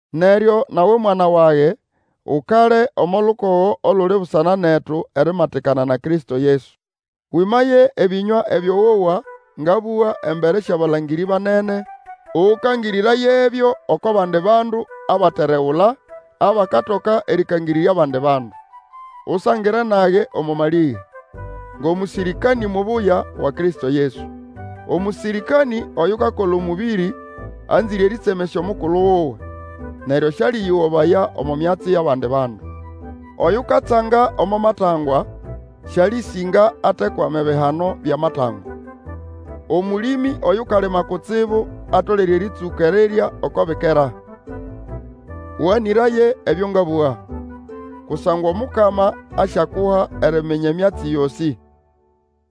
Neryo nawe mwana wage, ukale omo lukogo oluli busana netu erimatikana na Kristo Yesu. Wĩmaye ebĩnywa ebyo wowa ngabũga embere syʼabalangĩrĩ banene, ũkangĩrĩrayebyo oko bandi bandu abateregula, abakatoka erĩkangĩrĩrya abandi bandu. Usangire nage omo malĩge, ngʼomũsĩrĩkanĩ mubuya wa Kristo Yesu. Omũsĩrĩkanĩ oyukakola omũbĩrĩ, anzĩre erĩtsemesya omukulu wuwe, neryo sĩalĩyĩgobaya omo myatsi yʼabandi bandu. Oyukatsanga omo matangwa sĩalĩsĩnga atekwama ebihano byʼamatangwa. Omũlĩmĩ Oyukalima kutsibu atolere erĩtsũka erirya oko bikera. Ũganĩraye ebyo ngabũga, kusangwa Omukama asyakuha eriminya emyatsi yosĩ.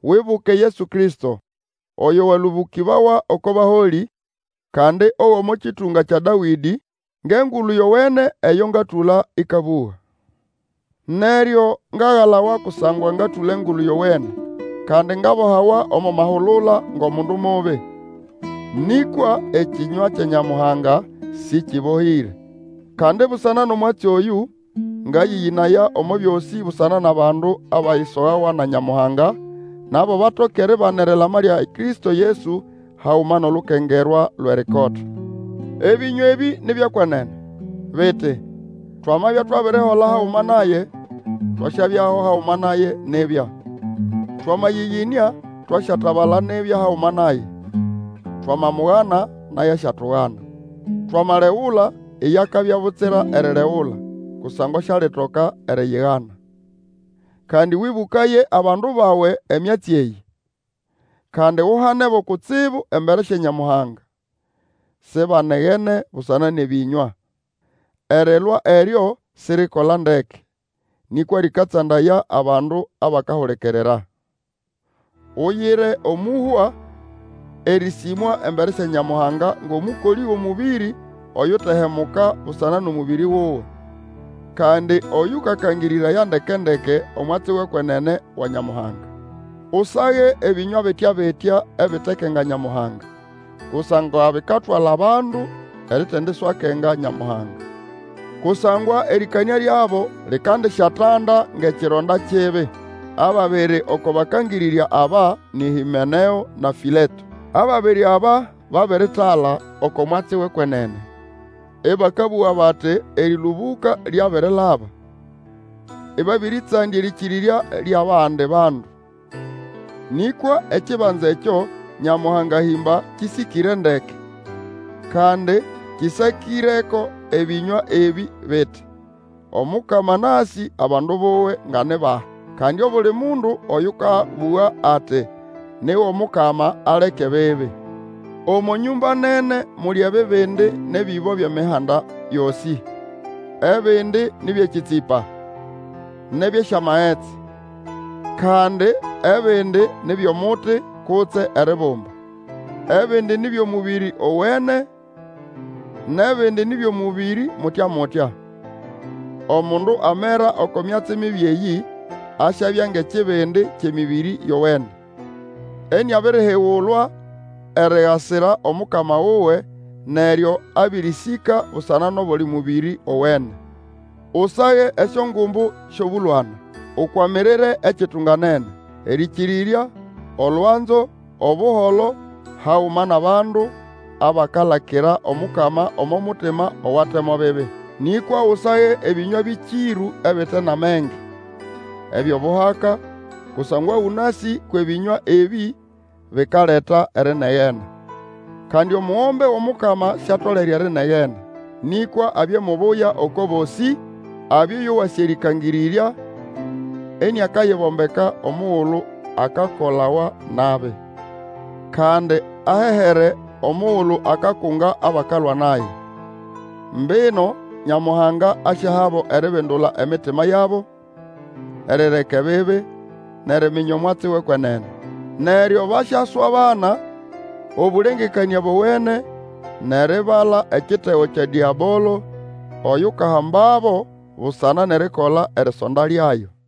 Wibuke Yesu Kristo, oyo walũbũkĩbawa oko baholĩ, kandi ogʼomo kĩtũnga kya Dawĩdĩ, ngʼEngulu Yowene eyo ngatũla ĩkabũga. Neryo ngagalawa kusangwa ngatũla Engulu Yowene, kandi ngabohawa omo mahulula ngʼomundu mubi. Nĩkwa ekĩnywa kya Nyamuhanga Sĩkĩbohĩre. Kandi busana nʼomwatsi oyũ, ngayĩyĩnaya omo byosĩ busana nʼabandu abayisogawa na Nyamuhanga, nabo batoke eribana erilama lya Kristo Yesu, haguma nʼolukengerwa lwʼerikota. Ebĩnywa ebĩ ni byʼekwenene, biti, Twamabya twabirihola haguma naye, Twasyabyaho haguma naye nibya; Twamayĩyĩnĩa, twasyatabala nibya haguma naye; Twamamugana, naye asyatugana; Twamalegula, iye akabya butsira eriregula, Kusangwa sialitoka eriyigana. Kandi wĩbũkaye abandu bawe emyatsi eyĩ, kandi uhanebo kutsibu embere sya Nyamuhanga, sibanegene busana nʼebĩnywa. Erilwa eryo siririkola ndeke, nĩkwa lĩkatsandaya abandu abakahulikirira. Uyire omũhwa erĩsĩmwa embere sya Nyamuhanga ngʼomũkolĩ wʼomũbĩrĩ oyutehemuka busana nʼomũbĩrĩ wuwe. Kandi oyũkakangĩrĩraya ndeke-ndeke omwatsi wʼekwenene wa Nyamuhanga. Usage ebĩnywa bitya-bitya ebitekenga Nyamuhanga, kusangwa bikatwala abandu eritendiswakenga Nyamuhanga. Kusangwa erĩkanĩa lyabo likandisyatanda ngʼekironda kibi. Ababiri oko bakangĩrĩrya aba nĩ Hĩmeneo na Fĩleto. Ababiri aba babiritala oko mwatsi wʼekwenene, ĩbakabũga bati erĩlũbũka lyabirilaba, ĩbabĩrĩtsandya erĩkĩrĩrya lyʼabandi bandu. Nĩkwa ekibanza ekyo Nyamuhanga ahĩmba kĩsĩkĩre ndeke, kandi kĩsakĩreko ebĩnywa ebĩ biti, Omukama anasĩ abandu buwe nga ni bahi. Kandi, Obuli mundu oyũkabũga ati ni wʼOmukama aleke ebibi. Omo nyũmba nene muli ebibindi nʼebĩbo byʼemihanda yosĩ. Ebindi nĩ byʼekĩtsĩpa nʼebyʼesyamagetsi, kandi ebindi ni byʼomuti kutse eribumba. Ebindi ni byʼomũbĩrĩ owene, nʼebindi ni byʼomũbĩrĩ mutya-mutya. Omundu amera oko myatsi mibi eyĩ, asyabya ngʼekibindi kyʼemĩbĩrĩ yowene, iniabirihigulwa erigasira Omukama wuwe, neryo abĩrĩsĩka busana nʼobuli mũbĩrĩ owene. Usage esyongumbu syʼobũlwana, ukwamirire ekitunganene, erĩkĩrĩrya, olwanzo, Obuholo, haguma nʼabandu abakalakira Omukama omo mutima owate mo bibi. Nĩkwa Usage ebĩnywa bĩkĩrũ ebite nʼamenge, ebyʼobuhaka, kusangwa ũnasĩ kwʼebĩnywa ebĩ bikaleta erinegena. Kandi omugombe wʼOmukama siatolere erinegena, nĩkwa abye mubuya oko bosĩ, abye oyo wasĩ erĩkangĩrĩrya, iniakayibombeka omugulu akakolawa nabi. Kandi ahehere omugulu akakunga abakalwa naye. Mbino Nyamuhanga asyahabo eribindula emitima yabo erireka ebibi, nʼeriminya omwatsi wʼekwenene. Neryo basyaswabana obũlengekanĩa bowene nʼeribala ekitego kya Dĩabolo, oyukahambabo busana nʼerikola erisonda lyayo.